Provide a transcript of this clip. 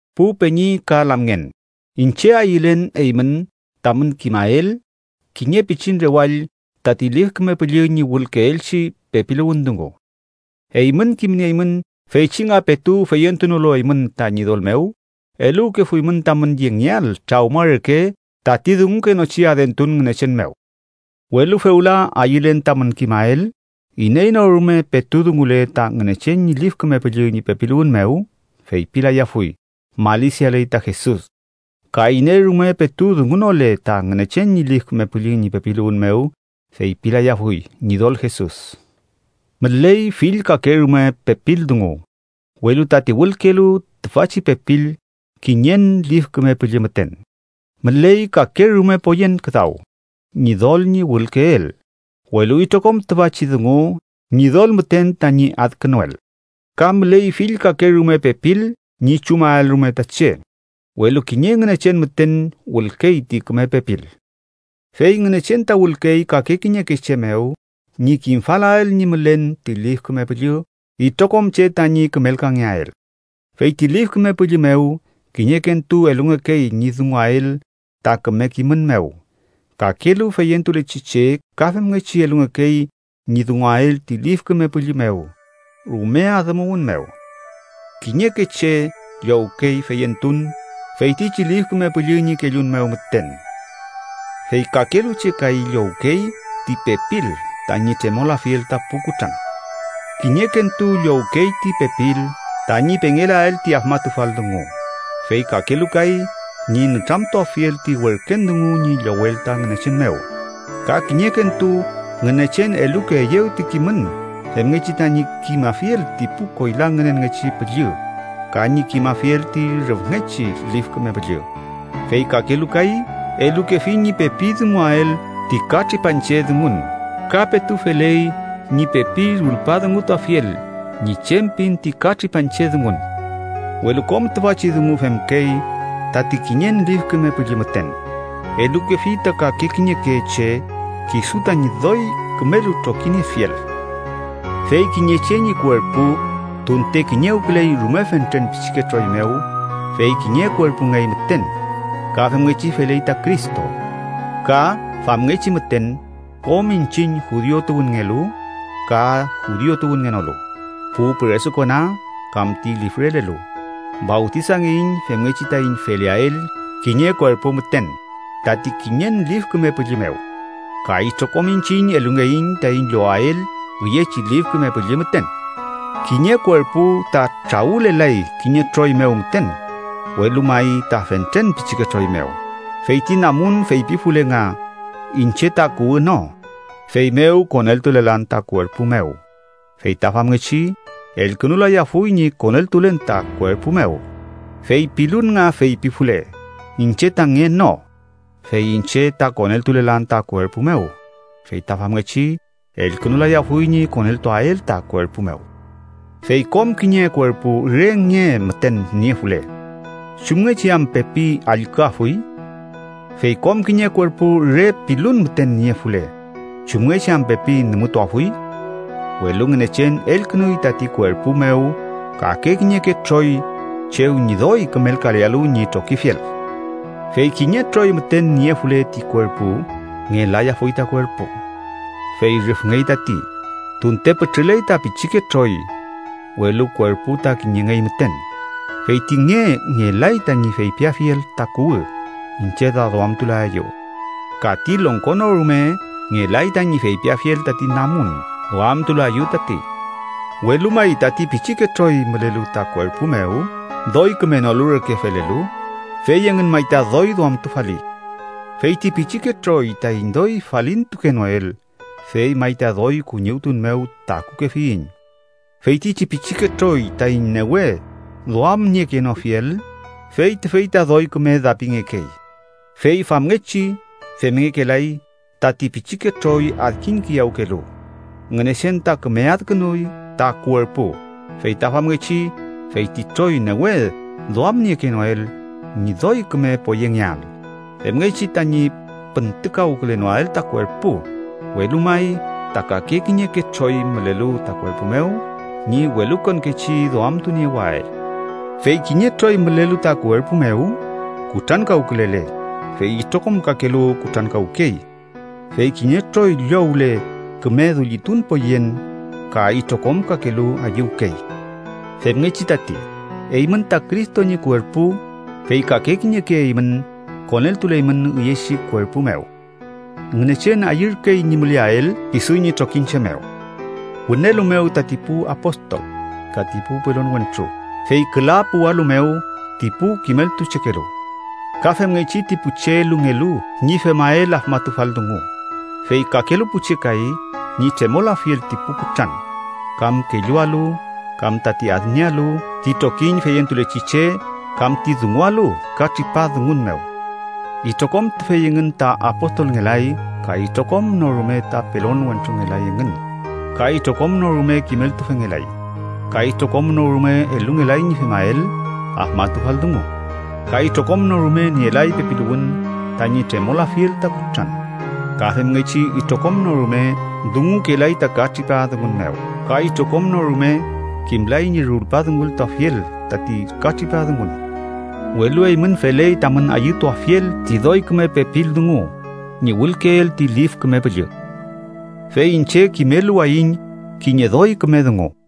Pu peñi ka lamngen, iñche ayülen eymün tamün kimael kiñe pichin rewall tati Lif Küme Püllü ñi wülkeelchi pepiluwün dungu. Eymün kimnieymün feychi nga petu feyentunolu eymün ta Ñidol mew, eluwkefuymün tamün yengeael trawma reke tati dungukenochi adentun ngünechen mew. Welu fewla ayülen tamün kimael iney no rume petu dungule ta Ngünechen ñi Lif Küme Püllü ñi pepiluwün mew feypilayafuy: “¡Malisialey ta Jesus!” Ka iney rume petu dungunole ta Ngünechen ñi Lif Küme Püllü ñi pepiluwün mew feypilayafuy: “¡Ñidol Jesus!” Müley fill kake rume pepil dungu, welu tati wülkelu tüfachi pepil kiñen Lif Küme Püllü müten. Müley kake rume poyen küdaw Ñidol ñi wülkeel, welu itrokom tüfachi dungu Ñidol müten tañi adkünuel. Ka müley fill kake rume pepil ñi chumael rume ta che, welu kiñe Ngünechen müten wülkey ti küme pepil. Fey Ngünechen ta wülkey kake kiñeke che mew ñi kimafalael ñi mülen ti Lif Küme Püllü itrokom che tañi kümelkangeael. Fey ti Lif Küme Püllü mew, kiñekentu elungekey ñi dunguael ta küme kimün mew. Kakelu feyentulechi che ka femngechi elungekey ñi dunguael ti Lif Küme Püllü mew rume adümuwün mew. Kiñeke che llowkey feyentun, feytichi Lif Küme Püllü ñi kellun mew müten, fey kakelu che kay llowkey ti pepil tañi tremolafiel ta pu kutran. Kiñekentu llowkey ti pepil tañi pengelael ti afmatufal dungu, fey kakelu kay ñi nütramtuafiel ti werken dungu ñi llowel ta Ngünechen mew. Ka kiñekentu Ngünechen elukeeyew ti kimün femngechi tañi kimafiel ti pu koyla ngünenngechi püllü ka ñi kimafiel ti rüfngechi Lif Küme Püllü, fey kakelu kay elukefi ñi pepi dunguael ti ka tripa dungun ka petu feley ñi pepi rulpadungutuafiel ñi chem pin ti ka tripa dungun Welu kom tüfachi dungu femkey tati kiñen Lif Küme Püllü müten. Elukefi ta kake kiñeke che kisu tañi doy kümelu trokiniefiel. Fey kiñe che ñi kuerpu, tunte kiñewküley rume fentren pichike troy mew, fey kiñe kuerpungey müten. Ka femngechi feley ta Cristo. Ka famngechi müten, kom iñchiñ, judiu tuwünngelu ka judiu tuwünngenolu, pu püresukona kam ti lifrelelu, fawtisangeiñ femngechi taiñ feleael kiñe kuerpu müten tati kiñen Lif Küme Püllü mew. Ka itrokom iñchiñ elungeiñ taiñ llowael üyechi Lif Küme Püllü müten. Kiñe kuerpu ta trawülelay kiñe troy mew müten, welu may ta fentren pichike troy mew. Fey ti namun feypifule nga: “Iñche ta kuwü no, feymew koneltulelan ta kuerpu mew.” Fey ta famngechi elkünulayafuy ñi koneltulen ta kuerpu mew. Fey pilun nga feypifule: “Iñche ta nge no, fey iñche ta koneltulelan ta kuerpu mew.” Fey ta famngechi elkünulayafuy ñi koneltuael ta kuerpu mew. Fey kom kiñe kuerpu re nge müten niefule, ¿chumngechi am pepi allküafuy? Fey kom kiñe kuerpu re pilun müten niefule, ¿chumngechi am pepi nümütuafuy? Welu Ngünechen elkünuy tati kuerpu mew kake kiñeke troy chew ñi doy kümelkalealu ñi trokifiel. Fey kiñe troy müten niefule ti kuerpu, ngelayafuy ta kuerpu. Fey rüfngey tati, tunte pütrüley ta pichike troy, welu kuerpu ta kiñengey müten. Fey ti nge ngelay tañi feypiafiel ta kuwü: “Iñche ta duamtulaeyu.” Ka ti longko no rume ngelay tañi feypiafiel tati namun: “Duamtulaeyu tati.” Welu may, tati pichike troy mülelu ta kuerpu mew, doy kümenolu reke felelu, fey engün may ta doy duamtufali. Fey ti pichike troy taiñ doy falintukenoel, fey may ta doy kuñiwtun mew takukefiyiñ. Feytichi pichike troy taiñ newe duamniekenofiel, fey tüfey ta doy küme dapingekey, fey famngechi femngekelay tati pichike troy adkiñkiyawkelu. Ngünechen ta küme adkünuy ta kuerpu feyta famngechi fey ti troy newe duamniekenoel ñi doy küme poyengeael femngechi tañi püntükawkülenoael ta kuerpu, welu may ta kake kiñeke troy mülelu ta kuerpu mew ñi welukonkechi duamtuniewael. Fey kiñe troy mülelu ta kuerpu mew kutrankawkülele, fey itrokom kakelu kutrankawkey, fey kiñe troy llowle küme dullitun poyen ka itrokom kakelu ayüwkey. Femngechi tati, eymün ta Cristo ñi kuerpu, fey kake kiñeke eymün koneltuleymün üyechi kuerpu mew. Ngünechen ayürkey ñi müleael kisu ñi trokiñche mew wünelu mew, tati pu apostol, ka ti pu pelon wentru, fey küla puwalu mew ti pu kimeltuchekelu, ka femngechi ti pu che elungelu ñi femael afmatufal dungu, fey kakelu pu che kay ñi tremolafiel ti pu kutran, kam kellualu, kam tati adniealu ti trokiñ feyentulechi che kam ti dungualu ka tripa dungun mew. Itrokom tüfey engün ta apostolngelay ka itrokom no rume ta pelon wentrungelay engün, ka itrokom no rume kimeltufengelay, ka itrokom no rume elungelay ñi femael afmatufal dungu. Ka itrokom no rume nielay pepiluwün tañi tremolafiel ta kutran. Ka femngechi itrokom no rume dungukelay ta ka tripa dungun mew, ka itrokom no rume kimlay ñi rulpadungultuafiel tati ka tripa dungun. Welu eymün feley tamün ayütuafiel ti doy küme pepil dungu ñi wülkeel ti Lif Küme Püllü. Fey iñche kimeluwayiñ kiñe doy küme dungu.